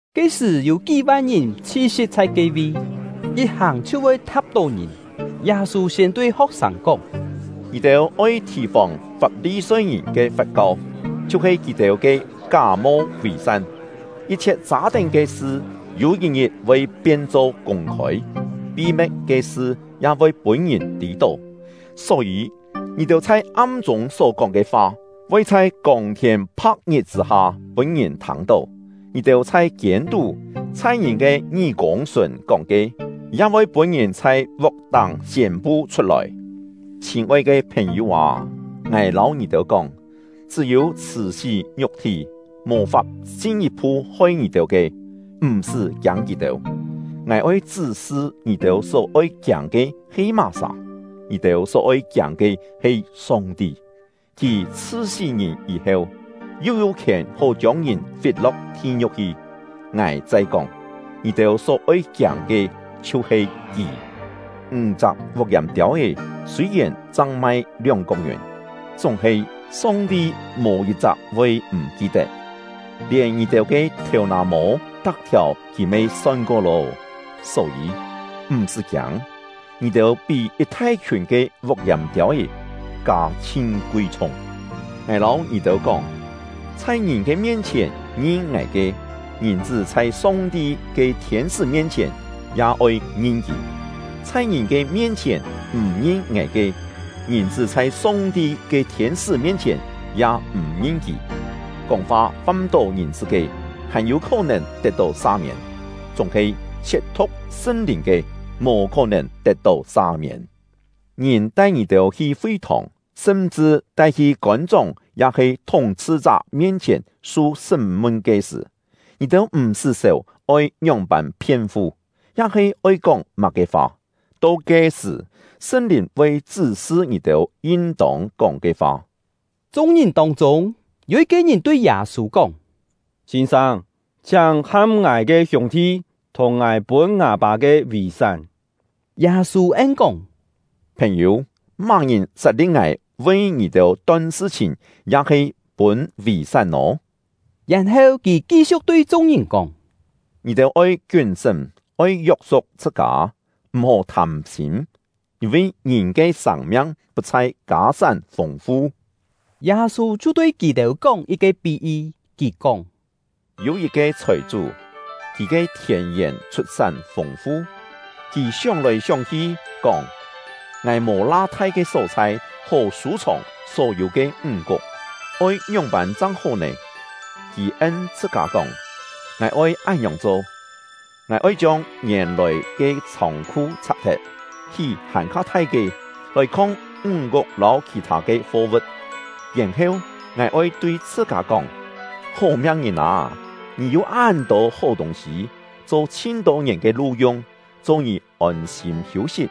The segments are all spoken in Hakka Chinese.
Ke-sṳ̀, yû kí-van ngìn chhi-si̍p chhai ke-vi, yit hàng chhiu voi tha̍p-tó ngìn. Yâ-sû siên tui ho̍k-sâng kóng: “Ngì-têu oi thì-fòng Fap-li-soi-ngìn ke fat-kau, chhiu-he kì-têu ke ká-mo vì-san. Yit-chhiet châ-tén ke sṳ yû yit-ngit voi pien-cho kûng-khôi, pi-me̍t ke sṳ ya voi pûn-ngìn tî-tó. Só-yî, ngì-têu chhai am-chûng só-kóng ke fa, voi chhai kông-thiên pha̍k-ngit chṳ̂-ha pûn-ngìn thâng-tó; ngì-têu chhai kiên-tú, chhai ngìn ke ngí-kûng sùn kóng ke, ya voi pûn-ngìn chhai vuk-táng siên-pu chhut-lòi. “Chhîn-oi ke phèn-yû â, ngài lâu ngì-têu kóng, chṳ́-yû chhṳ̀-sí ngiuk-thí, mò-fap chin yit-phu hoi ngì-têu ke, m̀-sṳ́ kiâng kì-têu. Ngài oi chṳ́-sṳ ngì-têu só-oi kiâng ke he má-sà: Ngì-têu só-oi kiâng ke he Song-ti; Kì chhṳ-sí ngìn yî-heu, yu yû khièn hó chiông ngìn fit-lo̍k thi-ngiu̍k hi. Ngài chai kóng, ngì-têu só-oi kiâng ke chhiu-he Kì! “Ńg-chak vuk-yàm-tiâu-é sûi-yèn chang mai lióng-kok ngiùn, chúng-he Song-ti mò yit-chak voi m̀ ki-tet; lièn ngì-têu ke thèu-nà-mô tak-thiàu Kì me son-ko lô! Só-yî, m̀-sṳ́ kiâng, ngì-têu pí yit thai-khiùn ke vuk-yàm-tiâu-é kâ chhin kui-chhung! “Ngài lâu ngì-têu kóng, chhai ngìn ke mien-chhièn ngin ngài ke, Ngìn-chṳ́ chhai Song-ti ke thiên-sṳ́ mien-chhièn ya oi ngin kì; chhai ngìn ke mien-chhièn m̀ ngin ngài ke, Ngìn-chṳ́ chhai Song-ti ke thiên-sṳ́ mien-chhièn ya m̀ ngin kì. “Kóng-fa fâm-tó Ngìn-chṳ́ ke, hàn-yû khó-nèn tet-tó sa-miên; chúng-he siet-thu̍k Sṳn-Lìn ke, mò khó-nèn tet-tó sa-miên. “Ngìn tai ngì-têu hi fi-thòng, sṳm-chṳ tai-hi kôn-chóng ya-he thúng-chhṳ-chá mien-chhièn su sṳ́m-mun ke sṳ̀, ngì-têu m̀-sṳ́ sèu oi ngióng-pân phien-fu, ya-he oi kóng má-ke fa; to ke-sṳ̀, Sṳn-Lìn voi chṳ́-sṳ ngì-têu yin-tông kóng ke fa.” Chung-ngìn tông-chûng, yû yit-ke ngìn tui Yâ-sû kóng: “Sîn-sâng, chhiáng ham ngài ke hiûng-thi thùng ngài pûn ngâ-pâ ke vì-sán.” Yâ-sû en-kóng: “Phèn-yû, má-ngìn sat-li̍p ngài vi ngì-têu ton sṳ-chhìn ya-he pûn vì-sán nò?” Yèn-heu, kì ki-siu̍k tui chung-ngìn kóng: “Ngì-têu oi kiún-sṳ́m! Oi yok-suk chhṳ-kâ, m̀-hó thâm-sîm; yîn-vi ngìn ke sâng-miang put-chhai kâ-sán fûng-fu.” Yâ-sû chhiu tui kì-têu kóng yit-ke pí-yi. Kì kóng: “Yû yit-ke chhòi-chú, kì ke thièn-yèn chhut-sán fûng-fu; kì sióng-lòi sióng-hi, kóng: ‘Ngài mò la thai ke só-chhai hó sû-chhòng só-yû ke ńg-kuk, oi ngióng-pân chang hó nè?’ Kì en chhṳ-kâ kóng: ‘Ngài oi án-ngiòng cho: Ngài oi chiông ngièn-lòi ke chhông-khu chhak-thet, hí hàn-kha thai ke, lòi khong ńg-kuk lâu khì-thâ ke fo-vu̍t; yèn-heu, ngài oi tui chhṳ-kâ kóng: Hó-miang ngìn â! Ngì yû án-tô hó tûng-sî, cho chhin-tô ngièn ke lu-yung. Cho ngì ôn-sîm hiû-sit,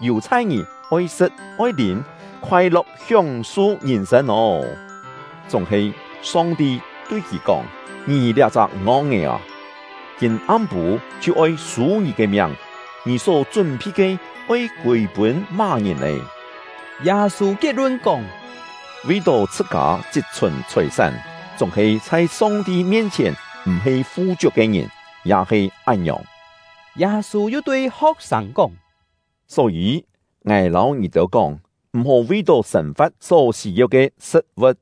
yù-chhai ngì oi sṳ̍t, oi lîm, khoai-lo̍k hióng-su ngìn-sên ô!’ Chúng-he, Song-ti tui kì kóng: ‘Ngì liá-chak ngong-é â, kîm-am-pû chhiu oi sû ngì ke miang; ngì só chún-phi ke oi kûi-pûn má-ngìn nè?’” Yâ-sû kiet-lun kóng: “Vi-tó chhṳ-kâ chit-chhùn chhòi-sán, chúng-he chhai Song-ti mien-chhièn m̀-he fu-chiuk ke ngìn, ya he án-ngiòng.” Yâ-sû yu tui ho̍k-sâng kóng: “Só-yî, ngài lâu ngì-têu kóng, m̀-hó vi-tó sên-fa̍t só sî-yeu ke sṳ̍t-vu̍t,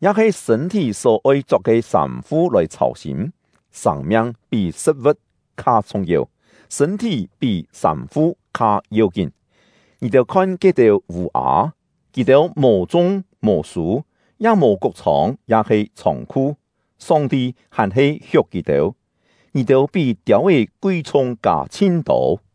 ya-he sṳ̂n-thí só-oi chok ke sâm-fu lòi chhâu-sîm. Sâng-miang pí sṳ̍t-vu̍t kha chhung-yeu; sṳ̂n-thí pí sâm-fu kha yeu-kín. Ngì-têu khon ke-têu vû-â: Kì-têu mò chung, mò sû, ya mò kuk-chhông ya-he chhông-khu, Song-ti hàn-he hiuk kì-têu; ngì-têu pí tiâu-é kui-chhung kâ chhin-tô!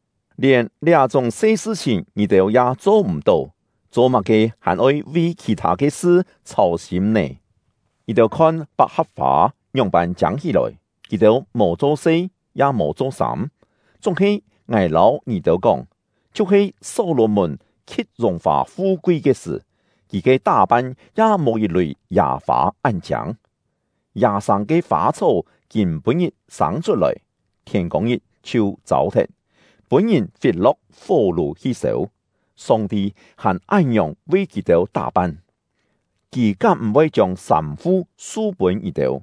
Lièn liá-chúng se sṳ-chhìn ngì-têu ya cho m̀-tó, cho-má-ke hàn-oi vi khì-thâ ke sṳ chhâu-sîm nè? Ngì-têu khon pak-ha̍p-fâ ngióng-pân chiâng hí-lòi! Kì-têu mò cho-se, ya mò cho-sâm; chúng-he ngài lâu ngì-têu kóng, chhiu-he Só-lò-mùn khi̍t yùng-fà fu-kui ke sṳ̀, kì ke tá-pan ya mò yit-lùi yâ-fâ án-chiâng. Yâ-sâng ke fâ-chhó kîm-pû-ngit sâng chhut-lòi, thiên-kông-ngit chhiu châu-thet, pûn-ngìn fit-lo̍k fó-lù hi sêu, Song-ti hàn án-ngiòng vi kì-têu tá-pan, Kì kám m̀-voi chiông sâm-fu su-pûn ngì-têu?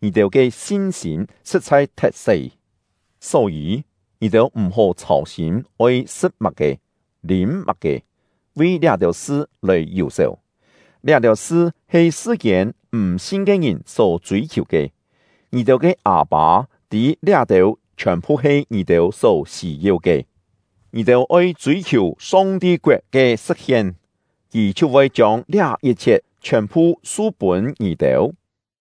Ngì-têu ke sin-sîm sṳ̍t-chhai thet-se! Só-yî, ngì-têu m̀-hó chhâu-sîm oi sṳ̍t má-ke, lîm má-ke, vi liá-têu sṳ lòi yù-sèu. Liá-têu sṳ he sṳ-kiên m̀-sin ke ngìn só chûi-khiù ke. Ngì-têu ke Â-pâ tî liá-têu chhiòn-phu he ngì-têu só sî-yeu ke. Ngì-têu oi chûi-khiù Song-ti koet ke sṳ̍t-hien, Kì chhiu voi chiông liá yit-chhiet chhiòn-phu su-pûn ngì-têu.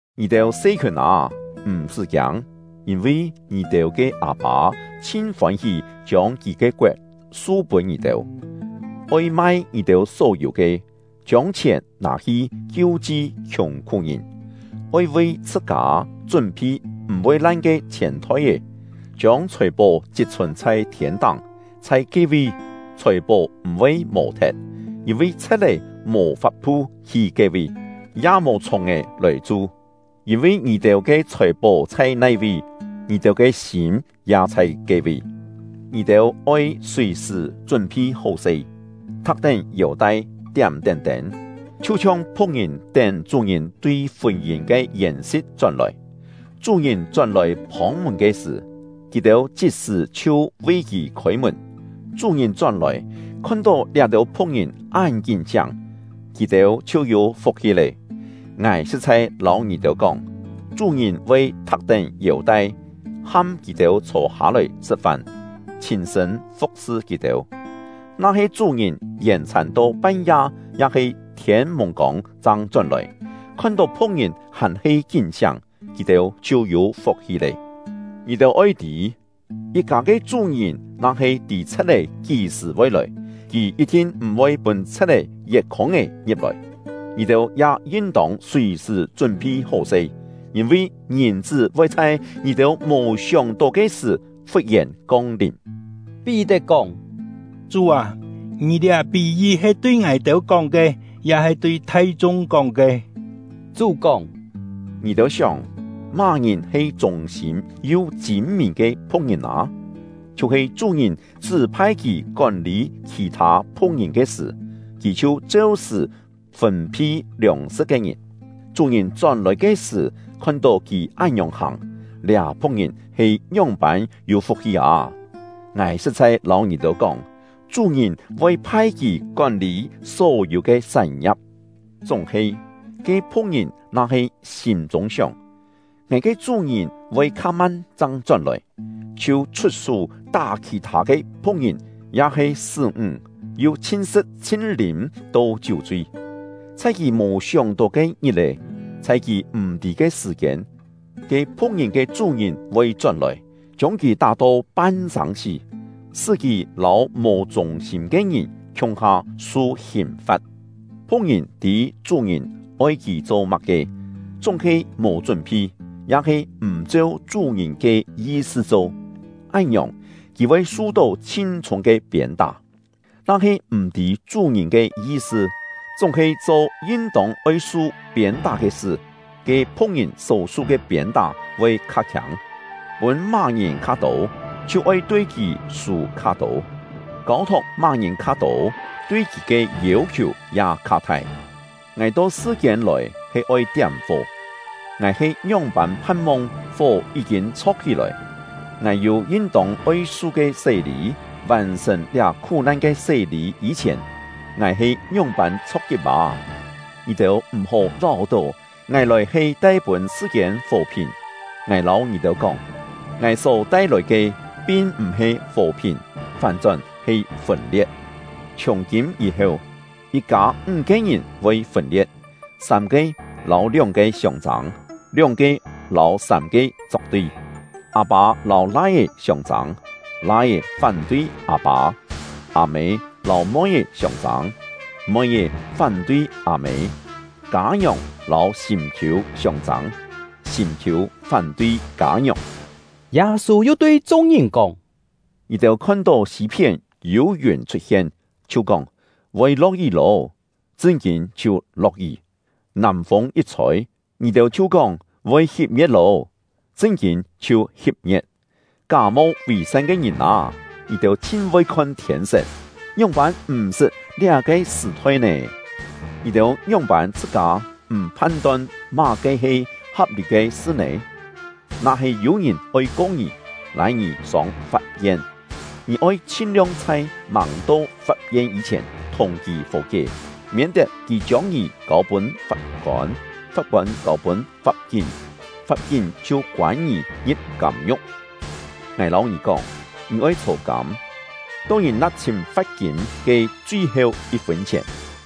“Ngì-têu se-khiùn â, m̀-sṳ́ kiâng, yîn-vi ngì-têu ke Â-pâ chhin fôn-hí chiông Kì ke koet su-pûn ngì-têu. Oi mai ngì-têu só yû ke, chiông chhièn nâ-hi kiu-chi khiùng-khú-ngìn; oi vi chhṳ-kâ chún-phi m̀-voi lan ke chhièn-thoi-é, chiông chhòi-pó chit-chhùn chhai thiên-táng. Chhai ke-vi, chhòi-pó m̀-voi mò-thet; yîn-vi chhe̍t-é mò fap-thu hi ke-vi, ya mò chhùng-è lòi chu. Yîn-vi ngì-têu ke chhòi-pó chhai nai-vi, ngì-têu ke sîm ya chhai ke-vi. “Ngì-têu oi sùi-sṳ̀ chún-phi hó-se, thak-tén yêu-tai, tiám-tén tên, chhiu-chhiong phu̍k-ngìn tén chú-ngìn tui fûn-yîn ke yèn-si̍t chón-lòi. Chú-ngìn chón-lòi phông-mùn ke sṳ̀, kì-têu chit-sṳ̀ chhiu vi kì khôi-mùn. Chú-ngìn chón-lòi, khon-tó liá-têu phu̍k-ngìn án kín-siáng, kì-têu chhiu yû fuk-hi lé! Ngài sṳ̍t-chhai lâu ngì-têu kóng, chú-ngìn voi thak-tén yêu-tai, ham kì-têu chhô-hâ-lòi sṳ̍t-fan, chhîn-sṳ̂n fu̍k-sṳ kì-têu. Na-he chú-ngìn yèn-chhàn to pan-ya ya-he thiên-mùng-kông chang chón-lòi, khon-tó phu̍k-ngìn hàn-he kín-siáng, kì-têu chhiu yû fuk-hi lé! Ngì-têu oi tî: Yit-kâ ke chú-ngìn na-he tî chhe̍t-é kí-sṳ̀ voi lòi, kì yit-thin m̀-voi pûn chhe̍t-é yet khûng-é ngi̍p-lòi. Ngì-têu ya yin-tông sùi-sṳ̀ chún-phi hó-se, yîn-vi Ngìn-chṳ́ voi chhai ngì-têu mò sióng-tó ke sṳ̀ fut-yèn kong-lìm.” Pí-tet kóng: “Chú â, ngì liá pí-yi he tui ngài-têu kóng ke, ya-he tui thai-chung kóng ke?” Chú kóng: “Ngì-têu sióng, má-ngìn he chûng-sîm yu chîn-mìn ke phu̍k-ngìn â? Chhiu-he chú-ngìn chṳ́-phai kì kón-lî khì-thâ phu̍k-ngìn ke sṳ̀, kì chhiu cheu-sṳ̀ fûn-phi liòng-sṳ̍t ke ngìn. Chú-ngìn chón-lòi ke sṳ̀, khon-tó kì án-ngiòng hàng, liá phu̍k-ngìn he ngióng-pân yû fuk-hi â! Ngài sṳ̍t-chhai lâu ngì-têu kóng, chú-ngìn voi phai kì kón-lî só-yû ke sán-ngia̍p. Chúng-he, ke phu̍k-ngìn na-he sîm-chûng sióng: ‘Ngài ke chú-ngìn voi kha-man chang chón-lòi’, chhiu chhut-sú tá khì-thâ ke phu̍k-ngìn ya-he sṳ́-ńg, yu chhin-sṳ̍t chhin-lîm to chiú-chui, chhai kì mò sióng-tó ke ngit-è, chhai kì m̀-tî ke sṳ̀-kiên, ke phu̍k-ngìn ke chú-ngìn voi chón-lòi, chiông kì tá-to pan-sâng-sí “tá-to pan-sâng-sí” ya-he yi̍t-cho “chhiet-to mièn-mièn”., sṳ́ kì lâu mò chûng-sîm ke ngìn khiung-ha su hìn-fa̍t. “Phu̍k-ngìn tî chú-ngìn oi kì cho má-ke, chúng-he mò chún-phi, ya-he m̀ cheu chú-ngìn ke yi-sṳ cho; án-ngiòng, kì voi su-tó chhin chhûng ke piên-tá. Na-he m̀-tî chú-ngìn ke yi-sṳ, chúng-he cho yin-tông oi su piên-tá ke sṳ, ke phu̍k-ngìn só-su ke piên-tá voi kha khiâng. Pûn má-ngìn kha-tô, chhiu oi tui kì sû kha-tô; kâu-thok má-ngìn kha-tô, tui kì ke yêu-khiù ya kha-thai. “Ngài to sṳ-kiên lòi he oi tiám-fó; ngài he ngióng-pân phan-mong fó yí-kîn chho̍k-hí-lòi! Ngài yû yin-tông oi su ke sé-lî; vàn-sṳ̀n liá khú-nan ke sé-lî yî-chhièn, ngài he ngióng-pân chho̍k-kip â! Ngì-têu m̀-hó láu-tó ngài lòi he tai-pûn sṳ-kiên fò-phìn; ngài lâu ngì-têu kóng, ngài só tai-lòi ke pin m̀-he fò-phìn, fán-chón he fûn-lie̍t. Chhiùng-kîm yî-heu, yit-kâ ńg-ke ngìn voi fûn-lie̍t, sâm-ke lâu lióng-ke siông-châng, lióng-ke lâu sâm-ke chok-tui. Â-pâ lâu lai-é siông-châng, lai-é fán-tui â-pâ; â-mê lâu moi-é siông-châng, moi-é fán-tui â-mê; kâ-ngiòng lâu sîm-khiû siông-châng, sîm-khiû fán-tui kâ-ngiòng.” Yâ-sû yu tui chung-ngìn kóng: “Ngì-têu khon-tó sî-phién yû yùn chhut-hien, chhiu kóng: ‘Voi lo̍k-yí lô’, chṳn-kîn chhiu lo̍k-yí. Nàm-fûng yit chhôi, ngì-têu chhiu kóng: ‘Voi hip-ngie̍t lô’, chṳn-kîn chhiu hip-ngie̍t. Ká-mo vì-san ke ngìn â! Ngì-têu chhin voi khon thiên-set, ngióng-pân m̀-sṳt liá-ke sṳ̀-thoi nè? “Ngì-têu ngióng-pân chhṳ-kâ m̀ phan-ton má-ke he ha̍p-lî ke sṳ nè? Na-he yû-ngìn oi ko ngì, lâi ngì sông fap-yen, ngì oi chhin-liong chhai màng to fap-yen yî-chhièn thùng kì fò-kié, miên-tet kì chiông ngì kâu-pûn fap-kôn, fap-kôn kâu-pûn fap-kín, fap-kín chhiu koân ngì ngi̍p kâm-ngiu̍k. Ngài lâu ngì kóng, ngì oi chhô-kâm, to ngì na̍p-chhîn fa̍t-kîm ke chui-heu yit-fûn chhièn.”